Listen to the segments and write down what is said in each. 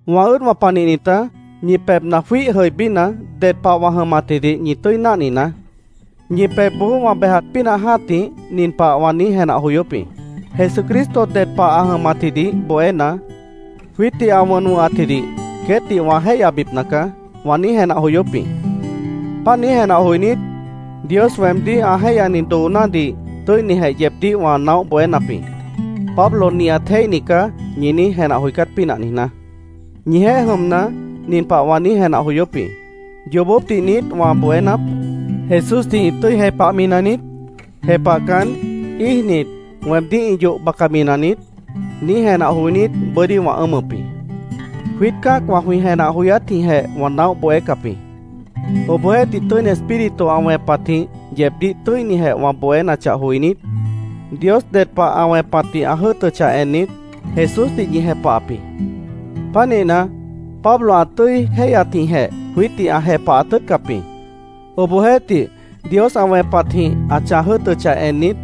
Wã ʉ́ʉdwã panihnitá, ñi pebhna jwíih jʉibína, ded pah wã jʉmatjidih ñi tʉ́i náhninaá. Ñi pebhboó wã bejat pínah jã́tih nin pah wã niíj jenah joyóp jĩ: “Jesucristo ded pah ã jʉmatjidih bohéna, jwiítdih ã wʉn wʉ̃hatjidih queétdih wã jéihyabipna caá”, wã niíj jenah joyóp jĩ. Páant niíj jenah joinít, Dios weemdíh ã jéihyani doonádih tʉ́inijeh yeebdíh wã naóh bohénap jĩ, “Pablo nihat jéihni caá”, ñi niíj jenah joicát pínah niijná. Ñijeéh jʉmna, nin pah wã niíj jenah joyóp jĩ: “¿Yoobópdih niít wã bohénap? ¿Jesúsdih ĩ tʉ́i jepahmi naniít? ¿Jepahcan, íijnit, weemdíh ĩ yoh bacami naniít?” niíj jenah joinít, bʉ́dí wã ʉ́ʉmʉp jĩ. Jwiít cã́acwã jwĩ jenah joyátjĩhjeh wã naóh bohécap jĩ. Obohjeéhtih, Tʉ́ini Espíritu ã wẽpatjĩh yeebdíh tʉ́inijeh wã bohénachah joinít, Dios ded pah ã wẽpatdih ã jʉ́ʉtʉchah ennit, Jesúsdih ñi jepahap jĩ. Pánihna, “Pablo ã tʉ́i jéihyatjĩhjeh jwiítdih ã jepahat tʉ́ʉtcap jĩ. Obohjeéhtih, Dios ã wẽpatjĩh ã chãj jʉ́ʉtʉchah ennit,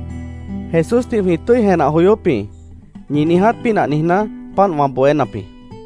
Jesúsdih jwĩ tʉ́i jenah joyóp jĩ”, ñi niiját pínah niijná, páant wã bohénap jĩ.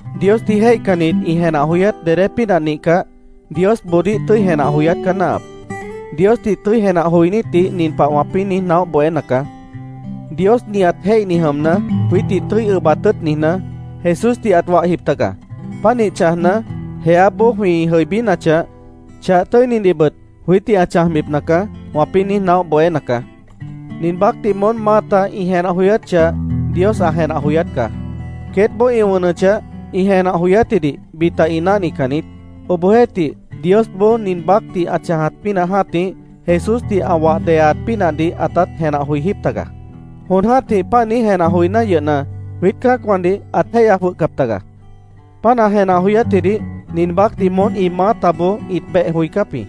Diosdih jéihcannit ĩ jenah joyát dedé pínah nihcah, Diosboodíh tʉ́i jenah joyát caá náahap. Diosdih tʉ́i jenah joinítdih nin pah wãpĩ́ niíj naóh bohéna caá: “Dios nihat jéihni jʉmna, jwiítdih tʉ́i ʉbat tʉ́ʉt niijná, Jesúsdih ãt wahjip taga. Pánih chãjna, jeáboó jwĩ jʉibínachah, chah tʉ́inidihbʉt jwiítdih ã chãjbipna caá”, wãpĩ́ niíj naóh bohéna caá. Nin baácdih moón maáta ĩ jenah joyát chah Dios ã jenah joyát caá. Queétboó ĩ wʉnʉchah, ĩ jenah joyátjidih bita ĩ náhnican niít. Obohjeéhtih, Diosboó nin baácdih ã chãjat pínah jã́tih, Jesúsdih ã wah deyaat pínahdih ãtát jenah joijíp taga. Jon jã́tih páant niíj jenah joiná yʉhna, jwiít cã́acwãdih ãt jéihya jwʉhcap taga. Páant ã jenah joyátjidih nin baácdih moón ĩ maátaboó ĩt beh joicáp jĩ.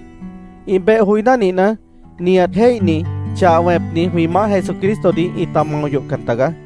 Ĩ beh joiná nihna, nihat jéihni, chah wẽpni, jwĩ Maáh Jesucristodih ĩta mao yohcan taga.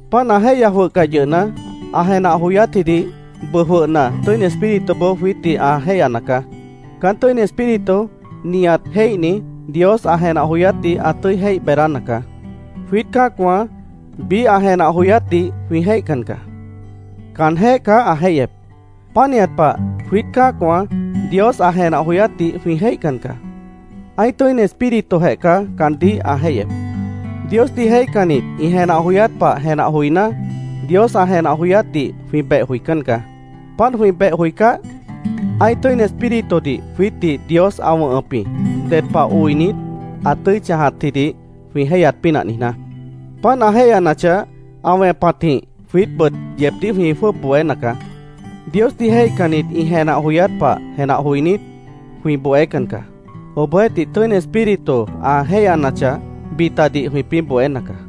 Páant ã jéihya jwʉhcah yʉhna, ã jenah joyátjidih bʉʉ jwʉhna Tʉ́ini Espírituboó jwiítdih ã jéihyana caá. Caán Tʉ́ini Espíritu nihat jéihni, Dios ã jenah joyátdih ã tʉ́i jéih beedána caá. Jwiít cã́acwã biíh ã jenah joyátdih jwĩ jéihcan caá. Caanjéh caá ã jéihyep. Pánihat pah, jwiít cã́acwã Dios ã jenah joyátdih jwĩ jéihcan caá. Ã́ih Tʉ́ini Espíritujeh caá caandíh ã jéihyep. Diosdih jéihcannit ĩ jenah joyát pah jenah joiná, Dios ã jenah joyátdih jwĩ beh joicán caá. Páant jwĩ beh joicáh, ã́ih Tʉ́ini Espíritudih jwiítdih Dios ã wʉ̃hʉp jĩ, ded pah oinit, ã tʉ́i chãjatjidih jwĩ jéihyat pínah niijná. Páant ã jéihyanachah, ã wẽpatjĩh jwiítbʉt yeebdíh jwĩ jwʉ́ʉb bohéna caá. Diosdih jéihcannit ĩ jenah joyát pah jenah joinít, jwĩ bohécan caá. Obohjeéhtih, Tʉ́ini Espíritu ã jéihyanachah, bitadih jwĩpĩ́ bohéna caá.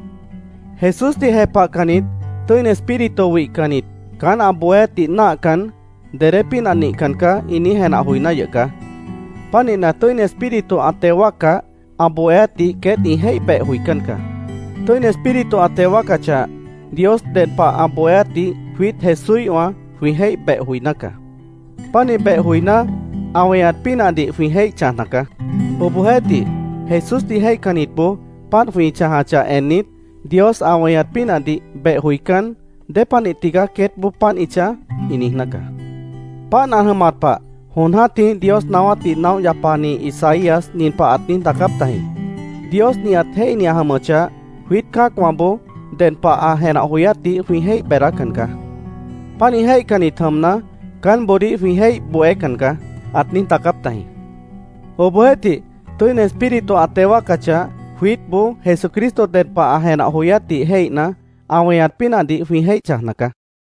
Jesúsdih jepahcannit, Tʉ́ini Espíritu wihcannit, caán ã bohéátdih náahcan, “Dedé pínah nihcan caá”, ĩ niíj jenah joiná yʉh caá. Pánihna, Tʉ́ini Espíritu ã teo wáaccah, ã bohéátdih queét ĩ jéih beh joicán caá. Tʉ́ini Espíritu ã teo wáacachah, Dios ded pah ã bohéátdih jwiít Jesúíhwã jwĩ jéih beh joiná caá. Pánih beh joiná, ã weñat pínahdih jwĩ jéih chãjna caá. Obohjeéhtih, Jesúsdih jéihcannitboó páant jwĩ chãjachah ennit, Dios ã weñat pínahdih beh joicán, “¿Dépanih tigaá queétboó páant ĩ chãj?” ĩ niijná caá. Páant ã jʉmat pah jon jã́tih Dios naáwátdih naóh yapani Isaías nin pah ãt niíj daacáp tajĩ: “Dios nihat jéihni ã jʉmʉchah, jwiít cã́acwãboó ded pah ã jenah joyátdih jwĩ jéih beedácan caá. Pánih jéihcannit jʉmna, caánboodíh jwĩ jéih bohécan caá”, ãt niíj daacáp tajĩ. Obohjeéhtih Tʉ́ini Espíritu ã teo wáacachah, jwiítboó Jesucristo ded pah ã jenah joyátdih jéihna, ã weñat pínahdih jwĩ jéih chãjna caá.